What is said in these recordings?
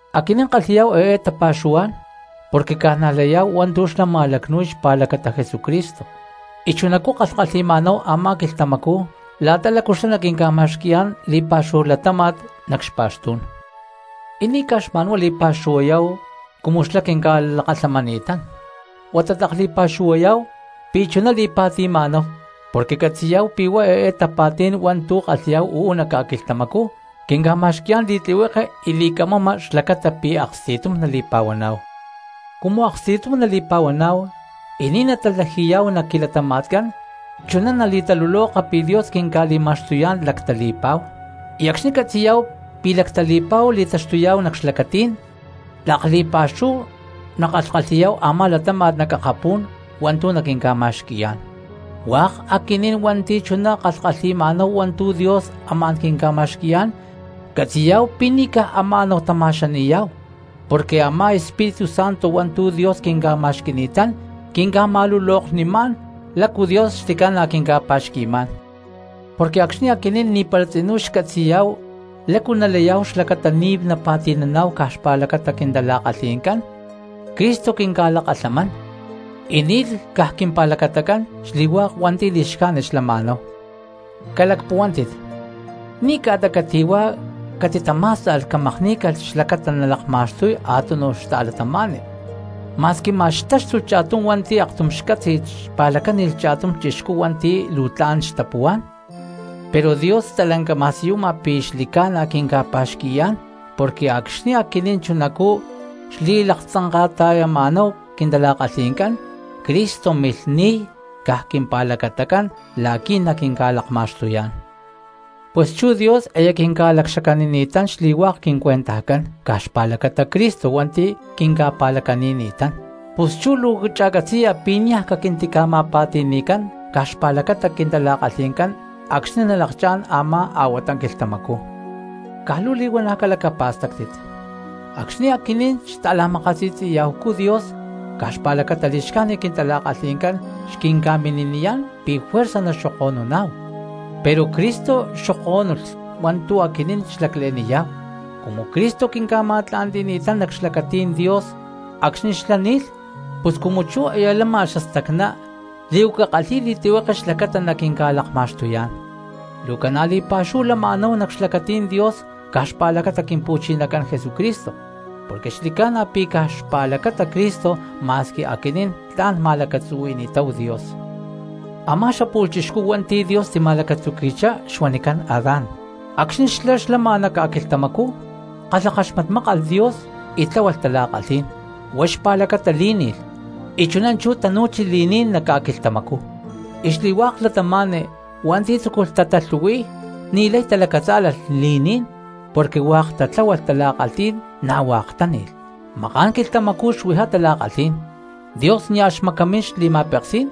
Aquinín kalhi̠yá̠hu eé tapa̠xuhuá̠n porque ca̠najlayá̠hu hua̠ntu̠ xlá ma̠lacnu̠y xpa̠lacata Jesucristo, y chunacú kalhkalhi̠ma̠náhu a̠má quilhtamacú la̠ta lácu xlá naquinca̠ma̠xqui̠yá̠n li̠pa̠xúhu latáma̠t nac xpa̠xtú̠n. Y ni̠ caj xma̠nhuá li̠pa̠xuhuayá̠hu cumu xlá quinca̠lakalhamani̠tán, huata tlak li̠pa̠xuhuayá̠hu pi̠ chuná li̠pa̠ti̠ma̠náhu, porque catzi̠yá̠hu pi̠ huá eé tapa̠tí̠n hua̠ntu̠ kalhi̠yá̠hu uú nac ca̠quilhtamacú quinca̠ma̠xqui̠yá̠n li̠tlihueke y li̠camama xlacata pi̠ aksti̠tum nali̠pa̠huaná̠hu. Cumu aksti̠tum nali̠pa̠huaná̠hu y ni̠ natatlaji̠yá̠hu nac quilatama̠tcán chuná nali̠taluloká̠hu pi̠ Dios quinca̠li̠ma̠xtuyá̠n lactali̠pa̠hu, y acxni̠ catzi̠yá̠hu pi̠ lactali̠pa̠hu li̠taxtuyá̠hu nac xlacatí̠n tlak li̠pa̠xúhu nakalhkalhi̠yá̠hu a̠má latáma̠t nac akapú̠n hua̠ntu̠ naquinca̠ma̠xqui̠yá̠n. Hua̠k aquinín hua̠nti̠ chuná kalhkalhi̠ma̠náhu hua̠ntu̠ Dios amá̠n quinca̠ma̠xqui̠yá̠n catzi̠yá̠hu pi̠ ni̠ caj ama̠náhu tama̠xani̠yá̠hu, porque a̠má Espíritu Santo hua̠ntu̠ Dios quinca̠ma̠xqui̠ni̠tán quinca̠ma̠luloknimá̠n lácu Dios xli̠ca̠na quinca̠pa̠xqui̠má̠n. Porque acxni̠ aquinín ni̠para tzinú xcatzi̠yá̠hu lácu nalayá̠hu xlacata ni̠ napa̠ti̠naná̠hu caj xpa̠lacata quintala̠kalhi̠ncán Cristo quinca̠lakalhamán y ni̠lh caj quimpa̠lacatacán xli̠hua̠k hua̠nti̠ li̠xcájnit xlama̠náhu. Calacpuhuántit, ni̠ ca̠ta cati̠huá catitamá̠sta̠lh camakní̠calh xlacata nalakma̠xtuy a̠túnuj cristiano, ma̠squi ma̠x xtáxtulh cha̠tum hua̠nti̠ aktum xcátzi̠lh xpa̠lacáni̠lh cha̠tum chixcú hua̠nti̠ luu tla̠n xtapuhuá̠n. Pero Dios stalanca ma̠siyuma pi̠ xli̠ca̠na quinca̠pa̠xqui̠yá̠n porque acxni̠ aquinín chunacú xtili̠laktzanka̠ta̠yama̠náhu quintala̠kalhi̠ncán Cristo milh ni̠y caj quimpa̠lacatacán la̠qui̠ naquinca̠lakma̠xtuyá̠n. Pus chú Dios aya quinca̠lacxacanini̠tán xli̠hua̠k quincuentajcán caj xpa̠lacata Cristo hua̠nti̠ quinca̠pa̠lacani̠ni̠tán. Pus chú luu cha̠catzi̠ya pi̠ niaj caquintica̠ma̠pa̠ti̠ni̠cán caj xpa̠lacata quintala̠kalhi̠ncán acxni̠ nalakchá̠n a̠má a̠huata quilhtamacú. Caj luu li̠huana̠ calacapa̠stáctit, acxni̠ aquinín xta̠la̠makasi̠tzi̠ya̠hucú Dios caj xpa̠lacata li̠xcájnit quintala̠kalhi̠ncán xquinca̠mini̠niyá̠n pi̠ juerza naxoko̠nuná̠hu, pero Cristo xoko̠núnilh hua̠ntu̠ aquinín xlacle̠niyá̠hu. Cumu Cristo quinca̠ma̠tla̠ntí̠n nac xlacatí̠n Dios acxni̠ xlá ni̠lh, pus cumu chú aya lama xastacná li̠huaca kalhi̠y li̠tlihueke xlacata naquinca̠lakma̠xtuyá̠n. Luu ca̠na̠ li̠pa̠xúhu lama̠náhu nac xlacatí̠n Dios caj xpa̠lacata Quimpu̠chinacán Jesucristo porque xli̠ca̠na pi̠ caj xpa̠lacata Cristo ma̠squi aquinín tla̠n ma̠lacatzuhui̠ni̠táhu Dios. Amá xapu̠lh chixcú hua̠nti̠ Dios tima̠lacatzuqui̠chá xuanicán Adán, acxni̠ xlá xlama nac ca̠quilhtamacú kalhakaxmatmákalh Dios y tláhualh tala̠kalhí̠n, huá xpa̠lacata lí̠ni̠lh y chuná chú tanu̠chi li̠ní̠n nac ca̠quilhtamacú. Y xli̠hua̠k cristianos hua̠nti̠ tzúculh tatalhu̠hui̠y ni̠lay talacatzá̠lalh li̠ní̠n porque hua̠k tatláhualh tala̠kalhí̠n, na̠ hua̠k táni̠lh. Maka̠n quilhtamacú xuijá tala̠kalhí̠n, Dios nia̠ xmacamín xli̠ma̠peksí̠n,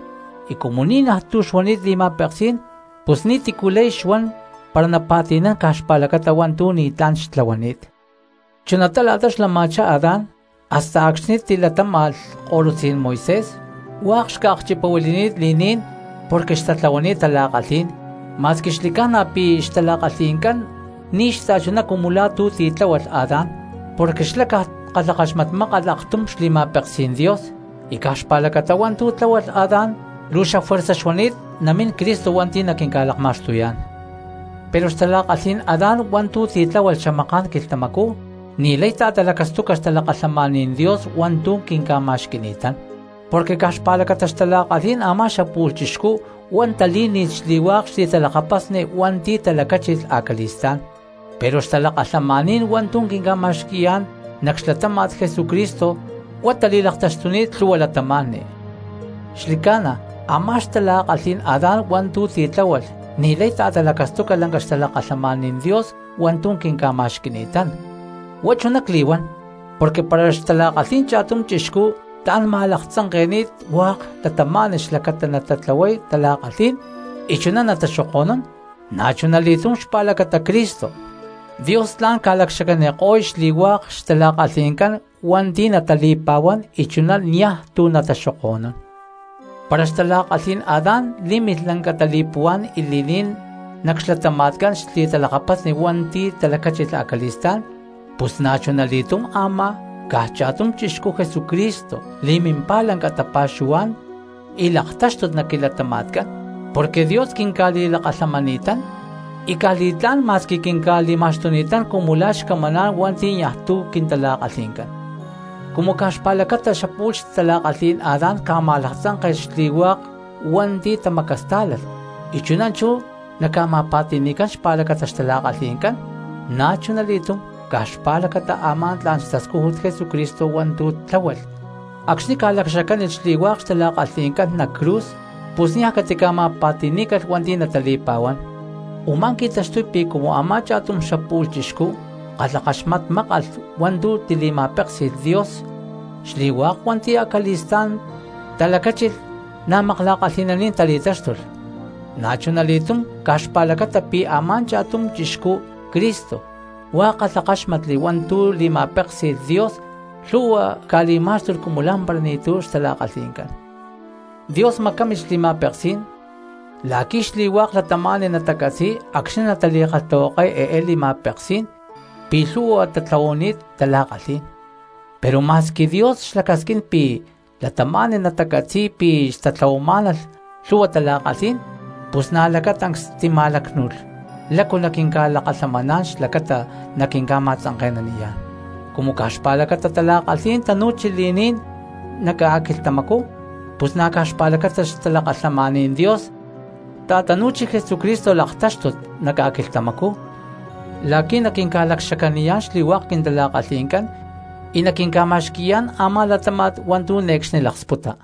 y cumu ni̠najtu̠ xuani̠t li̠ma̠peksí̠n pus ni̠tícu lay xuan para napa̠ti̠nán caj xpálacata hua̠ntu̠ ni̠tlá̠n xtlahuani̠t. Chunatá la̠ta xlama̠chá Adán hasta acxni̠ tilatáma̠lh ko̠lutzí̠n Moisés xli̠hua̠k cristianos xca̠akchipahuili̠ni̠t li̠ní̠n porque hua̠k xtatlahuani̠t tala̠kalhí̠n, ma̠squi xli̠ca̠na pi̠ huá xtala̠kalhi̠ncán u̠ma̠ko̠lh cristianos hua̠ntu̠ tatitláhualh ni̠ xta̠chuná cumu la̠ tu̠ titláhualh Adán porque xlá caj kalhakaxmatmákalh aktum xli̠ma̠peksí̠n Dios; y caj xpa̠lacata hua̠ntu̠ tláhualh Adán luu xafuerza xuani̠t namín Cristo hua̠nti̠ naquinca̠lakma̠xtuyá̠n. Pero xtala̠kalhí̠n Adán hua̠ntu̠ titláhualh xamaká̠n quilhtamacú ni̠lay ta̠talacastuca xtalakalhamaní̠n Dios hua̠ntu̠ quinca̠ma̠xqui̠ni̠tán. Porque caj xpa̠lacata xtala̠kalhí̠n a̠má xapu̠lh chixcú huá talí̠ni̠lh xli̠hua̠k xli̠talakapasni hua̠nti̠ talacáchilh acali̠stá̠n, pero xtalakalhamaní̠n hua̠ntu̠ quinca̠ta̠i̠yá̠n nac xlatáma̠t Jesucristo huá tali̠laktaxtuni̠t lhu̠hua cristianos. Xli̠ca̠na a̠má xtala̠kalhí̠n Adán hua̠ntu̠ titláhualh ni̠lay ta̠talacastuca lanca xtalakalhamaní̠n Dios hua̠ntu̠ quinca̠ma̠xqui̠ni̠tán. Huá chuná cli̠huán porque para xtala̠kalhí̠n cha̠tum chixcú tla̠n ca̠ma̠laktzanke̠ni̠t hua̠k cristianos xlacata natatlahuay tala̠kalhí̠n y chuná nataxoko̠nún, na̠chuna li̠túm xpa̠lacata Cristo, Dios tla̠n ca̠lacxacaniko̠y xli̠hua̠k xtala̠kalhi̠ncán cristianos hua̠nti̠ natali̠pa̠huán y chuná niaj tu̠ nataxoko̠nún. Para xtala̠kalhí̠n Adán lí̠milh lanca tali̠puhuá̠n y li̠ní̠n nac xlatama̠tcán xli̠talakapasni hua̠nti̠ talacáchilh acali̠stá̠n, pus na̠chuna li̠túm a̠má caj cha̠tum chixcú Jesucristo li̠mimpá lanca tapa̠xuhuá̠n y laktáxtut nac quilatama̠tcán, porque Dios quinca̠li̠lakalhamani̠tán y caj li̠tlá̠n ma̠squi quinca̠li̠ma̠xtuni̠tán cumu la̠ xcamaná̠n hua̠nti̠ niaj tu̠ quintala̠kalhi̠ncán. Cumu caj xpa̠lacata a̠má xapu̠lh xtala̠kalhí̠n Adán ca̠ma̠laktzánke̠lh xli̠hua̠k cristianos hua̠nti̠ tamacastá̠lalh y chuná chú naca̠ma̠pa̠ti̠ni̠cán xpa̠lacata xtala̠kalhi̠ncán, na̠chuna li̠túm caj xpa̠lacata a̠má tla̠n xtascújut Jesucristo hua̠ntu̠ tláhualh acxni̠ ca̠lacxacánilh xli̠hua̠k xtala̠kalhi̠ncán cristianos nac cruz, pus niaj catica̠ma̠pa̠ti̠ní̠calh hua̠nti̠ natali̠pa̠huán. Umá qui̠taxtuy pi̠ cumu a̠má cha̠tum xapu̠lh chixcú kalhakaxmatmákalh hua̠ntu̠ tili̠ma̠péksi̠lh Dios xli̠hua̠k hua̠nti̠ acali̠stá̠n talacáchilh na̠ makla̠kalhi̠naní̠n tali̠táxtulh, na̠chuna li̠túm caj xpa̠lacata pi̠ a̠má cha̠tum chixcú Cristo hua̠k kalhakáxmatli hua̠ntu̠ li̠ma̠péksi̠lh Dios lhu̠hua cristianos ca̠li̠má̠xtulh cumu la̠mpara ni̠tu̠ xtala̠kalhi̠ncán. Dios macámilh xli̠ma̠peksí̠n la̠qui̠ xli̠hua̠k cristianos natacatzíy acxni̠ natali̠kalhtahuakay eé li̠ma̠peksí̠n pi̠ lhu̠hua tatlahuani̠t tala̠kalhí̠n, pero ma̠squi Dios xlacasquín pi̠ cristianos natacatzi̠y pi̠ xtatlahuamá̠nalh lhu̠hua tala̠kalhí̠n, pus na̠ lacatancs tima̠lácnu̠lh lácu naquinca̠lakalhamaná̠n xlacata naquinca̠ma̠tzanke̠naniyá̠n. Cumu caj xpa̠lacata tala̠kalhí̠n tanu̠chi li̠ní̠n nac ca̠quilhtamacú pus na̠ caj xpa̠lacata xtalakalhamaní̠n Dios ta̠tanu̠chi Jesucristo laktáxtut nac ca̠quilhtamacú la̠qui̠ naquinca̠lacxacaniyá̠n xli̠hua̠k quintala̠kalhi̠ncán y naquinca̠ma̠xqui̠yá̠n a̠má latáma̠t hua̠ntu̠ ne̠cxni laksputa.